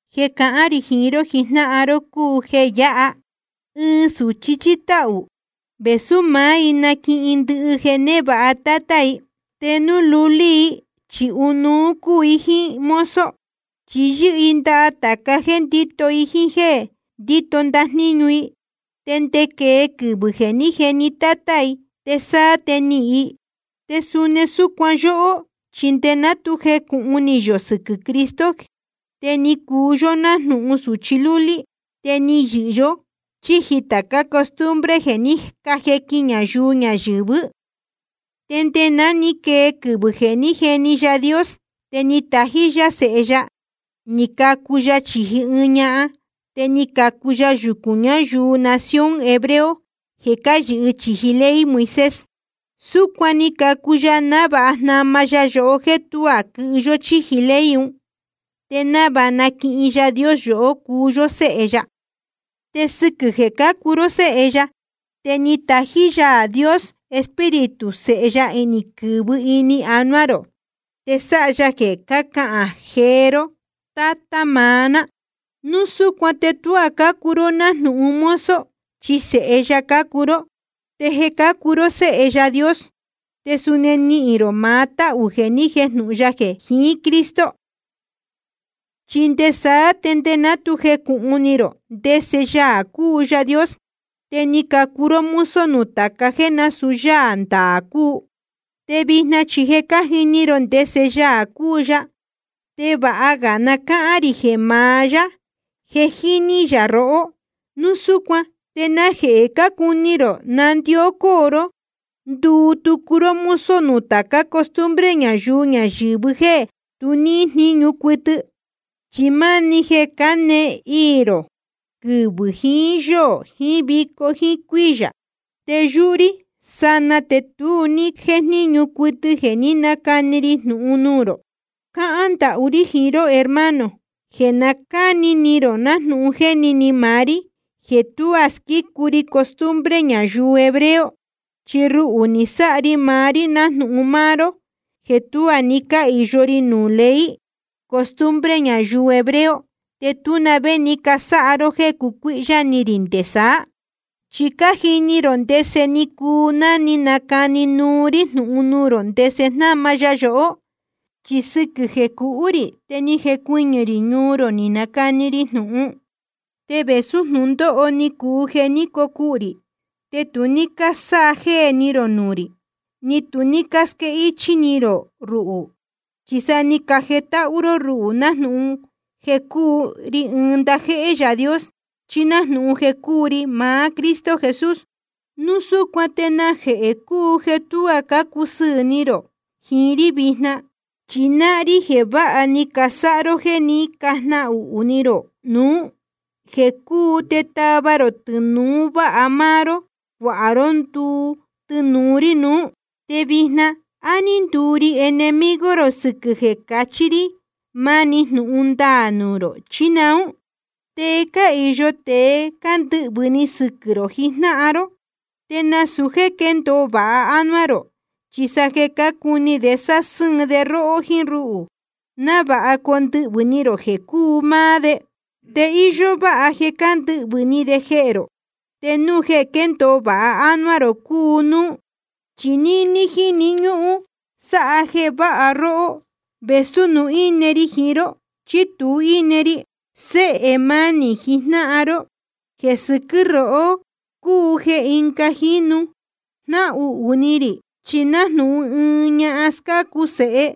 Jeē cahán rī jiín ró jijnáhan ró cúu jeē yáha: Ɨɨn sūchi chíí táhū, vēsú maá i naquihin ndɨhɨ jeē névāha tátá i, te núu lulí i chi ɨnuú cúu i jíín mozo. Chi yɨ́hɨ i ndaha tāca jéē ndíto i jíín jéē ndíto ndajníñu i, nde quee quɨvɨ̄ jeē ní jeni tátá i, te sáá te nihīn i. Te suni súcuan yóhó, chi nde ná tu jecūhun ni yō sɨquɨ̄ Cristo te ni cuu yó nájnūhun sūchi lúlí, te ni yɨhɨ yó chíji tācá costumbre jeē ní cajequin ñayuu ñayɨ̄vɨ́. Te nde ná ni quee quɨvɨ̄ jeē ní jeni Yaā Dios, te ni tají yá Sēhe ya, ni cacu ya chīji ɨɨn ñahan, te ni cacu ya yucūn ñayuu nación hebreo jeē cáyɨhɨ chīji ley Moisés. Súcuan ni cacu ya návāha jnama ya yohó jéē tuá quɨhɨ yó chíji ley un, te návāha naquihin Yaā Dios yohó cuu yó séhe ya. Te sɨquɨ̄ jeē cácuu ró séhe ya, te ni tají Yaā Dios Espíritu Sēhe ya ni quɨ̄vɨ ini anuá rō, te sáha ya jeē cácahān jee ró: Tátá maá ná. Núu súcuan te tuá cácuu ró nájnūhun mozo, chi sēhe ya cácuu ró. Te jeē cácuu ró séhe Yaā Dios, te suni nihīn rō maá táhū jeē ni jéjnūhun ya jeē jiín Cristo. Chi nde saá, nde ná tu jecūhun ni rō ndese Yaā cúu Yaā Dios, te ni cacuu ró mozo nuū tāca jéē násūu yáā ndaā cúu. Te vijna chi je cájini rō ndese Yaā cúu ya, te vāha ga na cáhán rī jeē maá yá je jíní yā rohó. Núu súcuan ¿te najehē cácuni rō nandió cóo ró nduu tucu ró mozo nuū tācá costumbre ñayuu ñayɨ̄vɨ jéē tu níhín jníñu cuɨtɨ? Chi máni jeē cánēe iī rō quɨvɨ̄ jiín yóō jiín vico jíín cuíyā. Te yúhú rí sanaa te tu ní jéjníñu cuɨtɨ jeē ní nacani ri jnūhun nuū rō. Cáhán ndahú rí jiín ró hermano, jeē na cáni ni rō nájnūhun jéni ni maá rí jeē tuá squícu ri costumbre ñayuu hebreo. Chi ruhū ni nasáha ri maá rí nájnūhun máá ró jeē tu ní cáyɨhɨ ró núū ley costumbre ñayuu hebreo. Te tú na vé ni cásáha ró jéē cucuíhyá ni rī nde saá. Chi cájini rō ndese ni cuu ná ni nacani núú rí jnūhun nuū rō ndese jnáma ya yohó. Chi sɨquɨ̄ jeē cuhú rī te ni jecuɨñɨ̄ rī ñuu rō ni nacani ri jnūhun. Te vēsú jnūndóho ni cuu jeē ní cocuhū rī, te tu ní cásájéē ni rō nuū rī, ni tu ní cásquéhichī ni rō ruhū. Chi sa ni cajetáhú ró ruhū nájnūhun jeē cúu ri ɨɨn ndajéhé Yaā Dios, chí nájnūhun jeē cúu ri maá Cristo Jesús. Núu súcuan ¿te najehē cúu jeē tuá cácusɨɨ̄ ni rō jiín rí vijna? Chi náhán rí jeē vāha ni casáha ró jéē ní cajnahuhū ni rō núu jeē cúu te tava rō tɨnūu váha máá ró, cuāha ró nduu tɨnūu rí nuú. Te vijna ¿á ní nduu ri enemigo rō sɨquɨ̄ jeē cachí rí máni jnūhun ndaā nuū rō, chí naún? Te cáhīyo tēe jeē cándɨhvɨ̄ ni sɨquɨ̄ rō jijnáhan ró, te nasūu jéē quéndōo vāha ánuá rō, chi sa jeē cácuni de nasásɨ́ɨn de róhó jíín rúhū, návāha condɨhvɨ̄ ni rō jeē cúu máá de. Te íyó váha jeē cándɨhvɨ̄ ni de jehē rō, te núu jeē quéndōo vāha ánuá rō cúu núú. Chi níní jíni ñúhún sáha de jeē váha róhó, vēsú núu íne ri jiín ró chí núu tú ri íne. Séhē mánī jijnáhan ró, jeē sɨquɨ́ rohó cúu jeē ɨnga jínu jnáhuhū ni rī, chi nájnūhun ɨɨn ñahan scácu sēhe,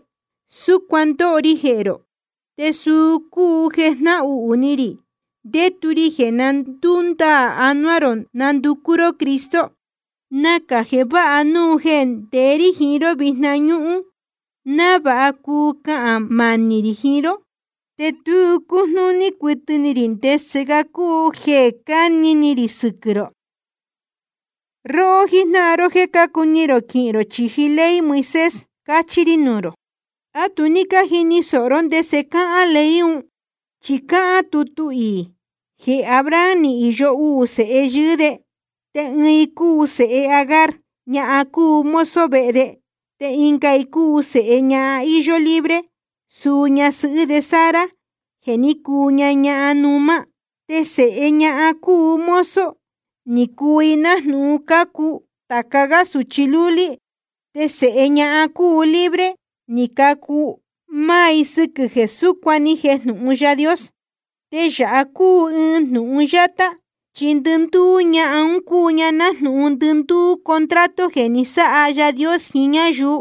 súcuan ndóho ri jehē rō. Te suu cúu jeē jnáhuhū ni rī ndétu ri jeē na ndúndaā anuá rō ndacu ró Cristo. Nacā jeē váha núu jeē ndeé rí jiín ró vijna ñúhún, návāha cuu cahān manī rī jiín ró. Te tu cújnúní cuɨtɨ ni rī ndese ga cúu jeē cáni ni rī sɨquɨ̄ rō. Róhó jíjnáhan ró jéē cácuni rō quɨhɨ ró chíji ley Moisés, cachi nuū rī: ¿A tu ní cájini sōho ró ndese cáhán ley un? Chi cáhán tutu iī jeē Abraham ni īyo uū sēhe yɨɨ́ de. Te ɨɨn i cúu sēhe Agar, ñahan cúu mozo vehe de. Te ɨnga i cúu sēhe ñahan íyó libre, suu ñasɨhɨ́ de Sara jeē ní cuu ña ñahan numá. Te sēhe ñahan cúu mozo, ni cacu i nájnūhun cácu tāca gá sūchi lúlí. Te sēhe ñahan cúu libre, ni cacu i máá sɨ́quɨ̄ jeē súcuan ni jejnūhun Yaā Dios. Te yāha cúu ɨɨn jnūhun yátá, chi ndɨndúú ñahan un cúu ña nájnūhun ndɨndúú contrato jeē ni sáha Yaā Dios jiín ñáyuu.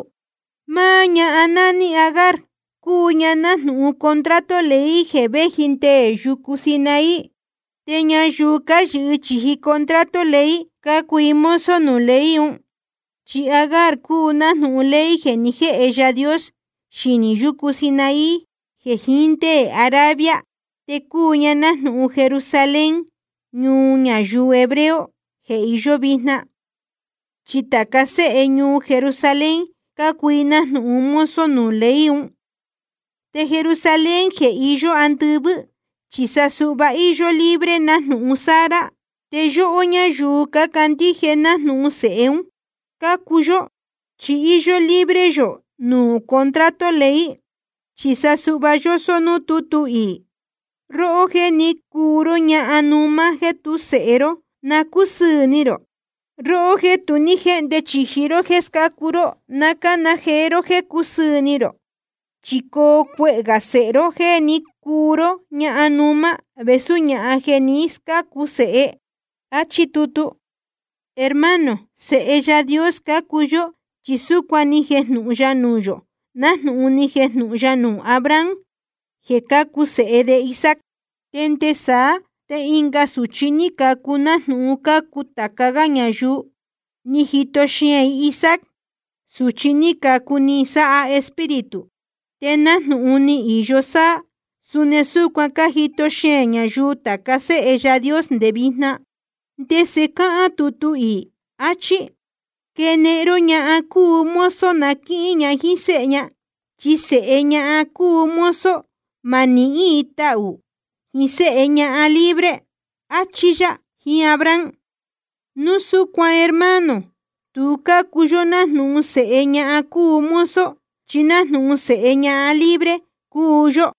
Máá ñahan nání Agar, cúu ña nájnūhun contrato ley jeē véji nde yucu Sinaí. Te ñayuu cáyɨhɨ chīji contrato ley, cácuu i mozo nuū ley un. Chi Agar cúu nájnūhun ley jeē ni jéhe Yaā Dios xinī yucu Sinaí jeē íin nde Arabia. Te cúu ña nájnūhun Jerusalén, ñuu ñayuu hebreo, jeē iyó vijna, chi tāca séhe ñuu Jerusalén, cácuu i nájnūhun mozo nuū ley un. Te Jerusalén jeē iyó andɨvɨ́, chi sa suhva íyó libre nájnūhun Sara. Te yóhó ñáyuu cácandíje, nájnūhun sēhe un cácuu yó, chi íyó libre yō nuū contrato ley. Chi suhva yósó núū tútu iī: Róhó jeē ní cuu ró ñahan numá jéē tú sēhe ró, na cúsɨɨ̄ ni rō. Róhó jéē tu ní jéhnde chīji ró jéē scácu ró, na cána jee ró jéē cúsɨɨ̄ ni rō. Chi coo cuehē gā sēhe róhó jéē ní cuu ró ñahan numá vēsú ñahan jeē jé ni scácu sēhe. Achí tutu. Hermano, sēhe Yaā Dios cácuu yó, chi súcuan ni jejnūhun ya nuū yō, nájnūhun ni jejnūhun ya nuū Abraham jeē cacu sēhe de Isaac. Te nde saá te ɨnga sūchi ní cacu nájnūhun cácu tāca gá ñayuu, ni jito xeēn i Isaac, sūchi ní cacu ni sáha Espíritu. Te nájnūhun ni īyo sáá, suni súcuan cájito xeēn ñayuu tāca séhe Yaā Dios nde vijna. ¿Te ndese cáhán tutu iī? Achí: Quenehen ró ñahan cúu mozo na quíhín ña jíín séhe ña. Chi sēhe ñahan cúu mozo, ma nihín i tahū jiín séhe ñahan libre, achí yá jiín Abraham. Núu súcuan hermano, tu cúu yó nájnūhun sēhe ñahan cúu mozo, chi nájnūhun sēhe ñahan libre cúu yó.